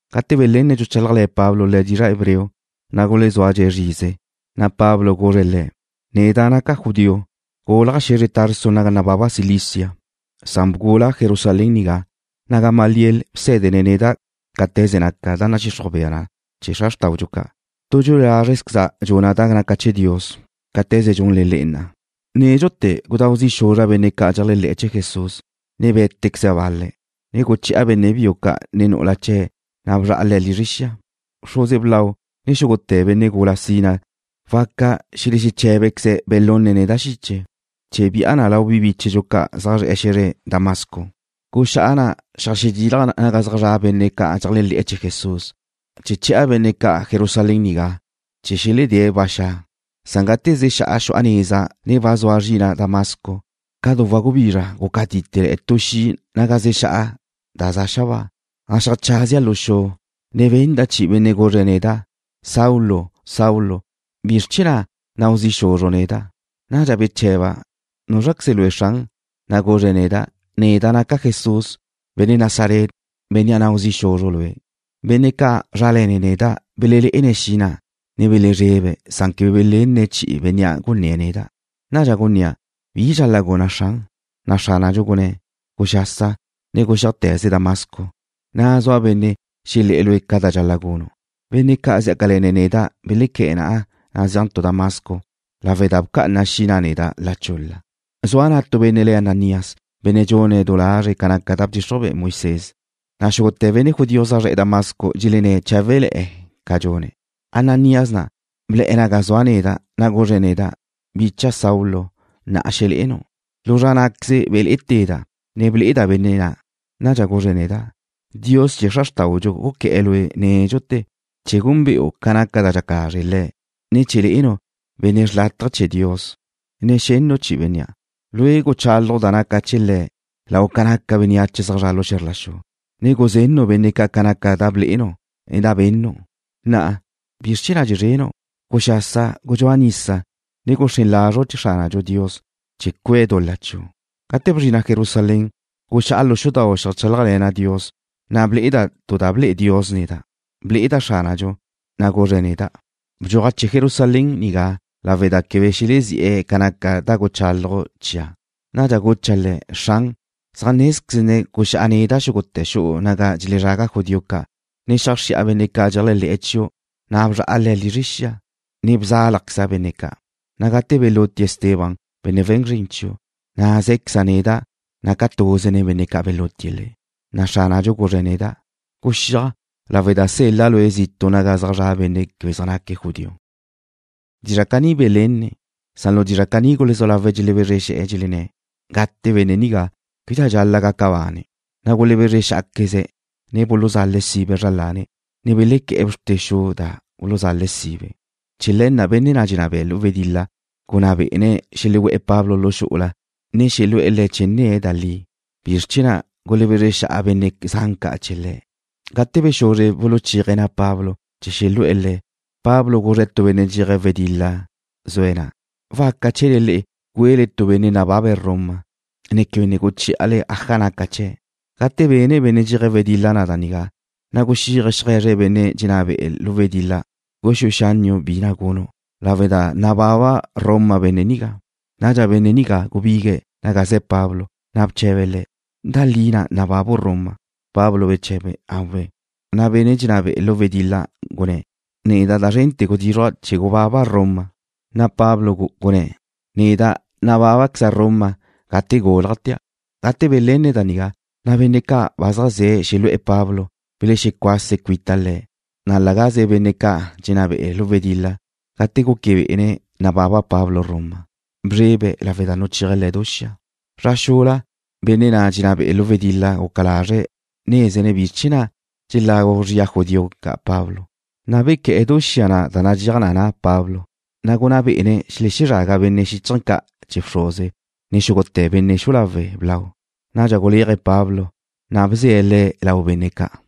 Gate belenne̱' dxuchálajle̱ Pablo le̱' dizra' hebreo, na' gulezúadxe̱' zrize, na' Pablo guzre̱' le̱': ―Neda' naca' judío. Gúlaja' xe̱zre Tarso naga nababa Cilicia, na' bgula' Jerusalén nigá, na' Gamaliel bsé̱dene̱' neda' cáte̱ze naca da nadxixruj bea na chee̱ xra xrtáudxu ca'. Tu dxue lázrezqueza' dxuna' da naca chee̱ Dios cáte̱ze dxunle le'e na'a. Nédxute̱ gudáu zi' xuzra' benne' ca' dxeléajle̱'e̱ chee̱ Jesús, ne bé̱tequeza' bal-le̱', ne guche̱'a benne' biu, ne nu'ula chee̱, na' bzra'a le̱' lizre xia. Bxruze blau, ne xúgute̱ benne' gula sina waca xelexeché̱bequeze̱' belunne̱' neda' xiche chee̱ bi'a na lau bi bíchedxu judío ca' zaj zre̱'e̱ xe̱zre Damasco. Guxá'a na' xeajxedilja' naga zaj zra' benne' ca' dxeléajle̱'e̱ chee̱ Jesús chee̱ che̱'a benne' ca' Jerusalén nigá, chee̱ xeledée̱' ba xa'. ’Gate zexá'a xu'a neza, ne ba zua zrina' Damasco, ca du wagubizra gúcatite' tu xi' naga zexá'a da za' xabáa. Na' xeajchazia' lu xu, ne benda' chi'i tu benne' guzre̱' neda': “Saulo, Saulo, ¿bizr chee̱ na' nau zi' xuzru' neda'?” Nadxa bche̱ba' le̱': ¿Núzraqueze lue', Xran? Na' guzre̱' neda': “Neda' naca' Jesús, benne' Nazaret, bénnea' nau zi' xuzru' lue'.” Benne' ca' zrále̱ne̱' neda' belelé'ene̱' xi' na', ne belezrebe̱', san quebe belenne̱' chi'i bénnea' gunné̱' neda'. Nadxa gunnéa': ¿Bi dxal-la' guna', Xran? Na' Xránadxu gunné̱': “Guxasa, ne guxíajte̱ze Damasco, ga na' zua benne' xelé̱'e̱ lue' ca da dxal-la' gunu'.” Benne' ca' zjácale̱ne̱' neda' belequé̱'e̱ na'a zeajntu' Damasco lawe' da bca'ana xi' na' neda' la chul-la. ’Zua na' tu benne' le̱' Ananías, benne' dxune̱' du lazre̱' ca naca da bdxixruj be'e Moisés, na' xúgute̱ benne' judío zaj zre̱'e̱ Damasco dxelenné̱' cháwele̱'e̱ ca dxune̱'. Ananías na' ble̱'e̱ naga zua' neda', na' guzre̱' neda': “Bicha' Saulo, na'a xele'enu'.” Lu zra ná'queze belé'ete̱da', ne ble'eda' benne' na'. Nadxa guzre̱' neda': “Dios chee̱ xra xrtáudxu guqué̱'e̱ lue' nédxute̱ chee̱ gúnbe'u ca naca da dxaca lazre' Le̱', ne chee̱ le'enu' Benne' xrlátaje chee̱ Dios, ne xennu' chi'i Bénnea'. Lue' guchálaju' da naca chee̱ Le̱' lau ca naca bénneache zaj zre̱'e̱ lu xe̱zr la xu, ne guzennu' benne' ca' ca naca da blé'enu', ne da bennu'. Na'a, ¿bizr chee̱ na' dxezrenu'? Guxasa, gudxúa nisa, ne bxren lazre' chee̱ Xránu' Dios chee̱ cuee̱' dul-la chiu'.” ’Gate bezrina' Jerusalén, guxá'a lu xudau' xeajchálajle̱na' Dios, na' ble'eda' tu da ble'e Dios neda'. Ble'eda' Xránadxu, na' guzre̱' neda': “Bdxuajche Jerusalén nigá lawe' da quebe xelezí'e̱ ca naca da guchálaju' chia'.” Nadxa gucha' Le̱': Xran, zaj nézquezne̱' guxá'a neda' xúgute̱ xu'u naga dxelezraga judío ca', ne xeajxri'a benne' ca' dxeléajle̱'e̱ chiu', na' bzra'a le̱' lizre xia, ne bzálajqueza' benne' ca', na' gate belútie̱' Esteban, benne' we̱n zrin chiu', na' zé̱queza' neda' naca' tuze nen benne' ca' belútie̱' le̱'. Xránadxu guzre̱' neda': “Guxíaj, lawe' da sel-la' lue' zitu' naga zaj zra' benne' quebe zaj naque̱' judío.” Dizra' caní belenne̱', san lu dizra' nigá gulezú lawe̱' dxelebezre xe̱'e̱, dxelenné̱': ―¡Gate benne' nigá! ¡Québedxa dxal-la' gaca bane̱'! Na' gulebezre xá'aqueze̱', ne buluzale̱' sibe zra lane̱', ne belequé̱'e̱ bxrte xu da buluzale̱' sibe. Chee̱ le̱ na' benne' na' dxenná be'e̱ lu wedil-la gunná bé'ene̱' xelegú'e̱ Pablo lu xu'ula, ne xelu'e̱ le̱' chee̱ nne̱' da li, bizr chee̱ na' gulebezre xa'a benne' zan ca' chee̱ le̱'. Gate bexuzre buluchéaje̱' na' Pablo, chee̱ xelu'e̱ le̱', Pablo guzre̱' tu benne' dxeaje̱' wedil-la zue̱' na': ―¿Naca chee̱le le'e güele tu benne' nababe̱' Roma, ne quebe ne guchí'ale aja naca chee̱'? Gate ben benne' dxeaje̱' wedil-la da nigá, na' guxíaje̱' xeaje̱zre̱' benne' dxenná be'e̱ lu wedil-la: ―Guxúe xánniu' bi na' gunu', lawe' da nababa Roma benne' nigá. Nadxa benne' nigá gubigue̱' naga ze̱ Pablo, na' bche̱be̱' le̱': ―¿Da li na' nababu' Roma? Pablo beche̱be̱': ―Awe'. Na' benne' dxenná be'e̱ lu wedil-la gunné̱': ―Neda' da zrente̱ gudízruja' chee̱ gubaba' Roma. Na' Pablo gunné̱': ―Neda' nabábaqueza' Roma gate gúlajtea'. Gate belenne̱' da nigá, na' benne' ca' ba zaj ze̱' xelu'e̱ Pablo belexecuase̱' cuita le̱', na' la gaze benne' na' dxenná be'e̱ lu wedil-la, gate guque bé'ene̱' nababa Pablo Roma, bzrebe̱' lawe' da nuchéaje̱' le̱ du xia. Zra xula, benne' na' dxenná be'e̱ lu wedil-la guca lazre̱' nézene̱' bi chee̱ na' dxelagu zria judío ca' Pablo, na' bequé̱'e̱ du xia na' nadxéaj na na' Pablo, na' gunná bé'ene̱' xelezraga benne' xíchaje̱ ca' chee̱ bxruze, ne xúgute̱ benne' xu'u lawe' blau. Nadxa guléaje̱' Pablo, na' bze̱' le̱' lau benne' ca'.